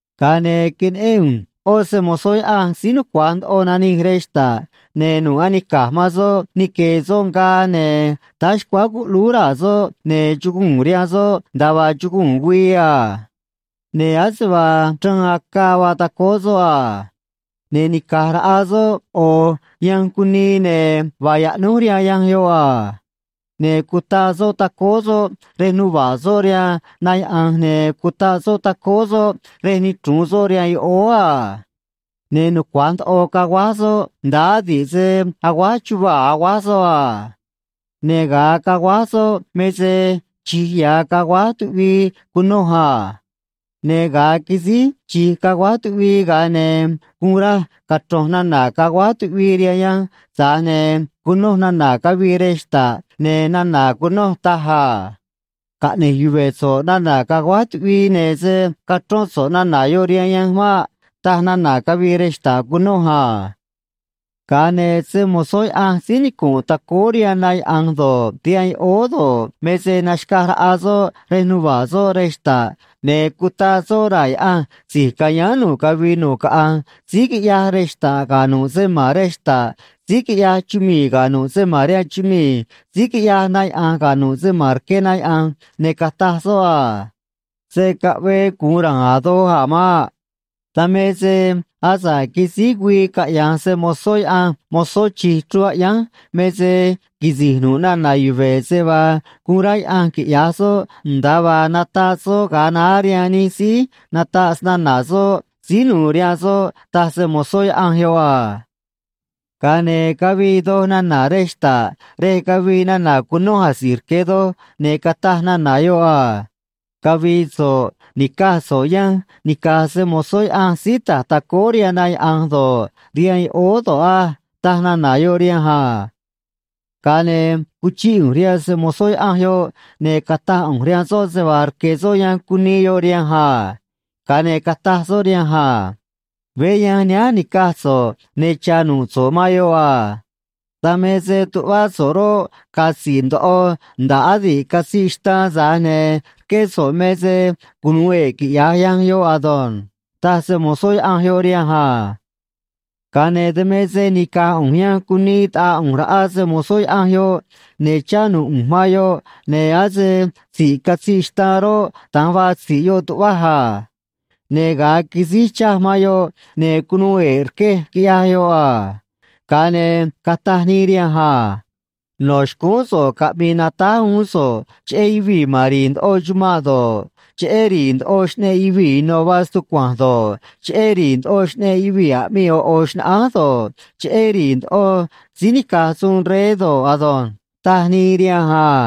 Ga̱a ne̱ queneꞌén ꞌu̱nj ꞌó se‑mo̱zó Yaꞌanj síí nucua̱j ndoꞌo nanij rej xta̱ꞌ, ne̱ nu̱ꞌ anica̱j man soꞌ nique̱e̱ soꞌ ngaa, ne̱ táá xcuáá cuꞌlúú raa̱ soꞌ, ne̱ chuguu̱n rihaan soꞌ nda̱a vaa chuguu̱n güii a. Ne̱ ase vaa chraan acaa vaa tacóó soꞌ a. Ne̱ nica̱j raꞌa soꞌ ꞌo̱ yanj cunii, ne̱ vaa yaꞌnúj rihaan yanj yoꞌ a. Ne̱ cutaꞌ soꞌ tacóó soꞌ rej nuva̱ꞌ soꞌ rihaan na yaꞌa̱nj, ne̱ cutaꞌ soꞌ tacóó soꞌ rej nichru̱un soꞌ rihaan yoꞌóó a. Ne̱ nucua̱j ndoꞌo caguáj soꞌ, nda̱ꞌ adi̱ꞌ se aguáj chuvaa̱ aguáj soꞌ a. Ne̱ ga̱a caguáj soꞌ me se chi̱j ya̱ caguáj tuꞌvii cunoj a. Ne̱ ga̱a quisíj chi̱j caguáj tuꞌvii, ga̱a ne̱ guun raj cachro̱nj nana̱ caguáj tuꞌvii rihaan yanj, tza̱j ne̱ cunoj nana̱ cavii rej xta̱ꞌ, ne̱ nana̱ cunoj taj a: ―Caꞌne̱j yuve̱ so̱ꞌ nana̱ caguáj tuꞌvii, ne̱ se̱ cachrón so̱ꞌ nana̱ yoꞌ rihaan yanj maꞌ ―taj nana̱ cavii rej xta̱ꞌ cunoj a. Ga̱a ne̱ se‑mo̱zó Yaꞌanj síí nicu̱nꞌ tacóó rihaan na yaꞌa̱nj do̱ꞌ, rihaan yoꞌóó do̱ꞌ, me se naxca̱j raꞌa soꞌ rej nuva̱ꞌ soꞌ rej xta̱ꞌ, ne̱ cutaꞌ soꞌ raa̱ Yaꞌanj si̱j ca̱yáán nu̱ꞌ cavii nu̱ꞌ caꞌanj síí quiꞌyaj rej xta̱ꞌ ga̱ nu̱ꞌ se ma̱n rej xta̱ꞌ, síí quiꞌyaj chumii̱ ga̱ nu̱ꞌ se ma̱n rihaan chumii̱, síí quiꞌyaj na yaꞌa̱nj ga̱ nu̱ꞌ se ma̱n rque na yaꞌa̱nj, ne̱ cataj soꞌ a: ―Se̱ caꞌvee gu̱un ra̱a̱n a̱ doj a̱ maꞌ. Dan me se asa̱ꞌ quisíj güii caꞌya̱nj se‑mo̱zó Yaꞌanj mozó chi̱j chruun aꞌyánj me se quisi̱j nu̱ꞌ nana̱ yuve̱ se vaa guun rá Yaꞌanj quiꞌya̱j soꞌ, nda̱a vaa nataꞌ soꞌ ga̱a naá rihaan nij síí nataꞌ snana̱ soꞌ síí nu̱u̱ rihaan soꞌ ―taj se‑mo̱zó Yaꞌanj yoꞌ a. Ga̱a ne̱ cavii doj nana̱ rej xta̱ꞌ, rej cavii nana̱ cunoj asi̱j rque̱ doj, ne̱ cataj nana̱ yoꞌ a: ―Cavi̱i̱ so̱ꞌ ni̱caj so̱ꞌ yanj nica̱j se‑mo̱zó Yaꞌanj síí ta̱j tacóó rihaan na yaꞌa̱nj do̱ꞌ, rihaan yoꞌóó do̱ꞌ á ―taj nana̱ yoꞌ rihanj a. Ga̱a ne̱ cuchíꞌ ꞌu̱nj rihaan se‑mo̱zó Yaꞌanj yoꞌ, ne̱ cataj ꞌu̱nj rihaan soꞌ se vaa rque̱ soꞌ yanj cunii yoꞌ rihanj a. Ga̱a ne̱ cataj soꞌ rihanj a: ―Veé yanj nihánj ni̱caj so̱ꞌ, ne̱ cha̱ nu̱ꞌ so̱ꞌ man yoꞌ a. Dan me se tuꞌvá so̱ꞌ roꞌ, ga̱a̱ tzi̱ꞌ ndoꞌo nda̱ꞌ adi̱ꞌ catziꞌ xtaan, tza̱j ne̱ rqué so̱ꞌ me se cunu̱u e̱ꞌ, quiꞌya̱j yanj yoꞌ ado̱nj ―taj se‑mo̱zó Yaꞌanj yoꞌ rihanj a. Ga̱a ne̱ dan me se nica̱j ꞌu̱nj yanj cunii taꞌaa ꞌu̱nj raꞌa se‑mo̱zó Yaꞌanj yoꞌ, ne̱ chá nu̱ꞌ ꞌu̱nj man yoꞌ, ne̱ ase tzi̱ꞌ catziꞌ xtaan roꞌ, da̱nj vaa tzi̱ꞌ yoꞌ tuꞌvaj a. Ne̱ ga̱a quisíj chaj man yoꞌ, ne̱ cunuu e̱ꞌ rquej, quiꞌyaj yoꞌ a. Ga̱a ne̱ cataj nii rihanj a: ―No̱ xcúún so̱ꞌ caꞌmi̱i̱ natáj uún so̱ꞌ cheꞌé yuvii̱ ma̱n ri̱i̱ ndoꞌo chumanꞌ do̱ꞌ, cheꞌé ri̱i̱ ndoꞌo xꞌneꞌ yuvii̱ ino̱ vaa stucua̱nj do̱ꞌ, cheꞌé ri̱i̱ ndoꞌo xꞌneꞌ yuvii̱ aꞌmii ꞌo̱ ꞌo̱ xnaꞌánj do̱ꞌ, cheꞌé ri̱i̱ ndoꞌo síí nica̱j suun rey do̱ꞌ ado̱nj ―taj nii rihanj a.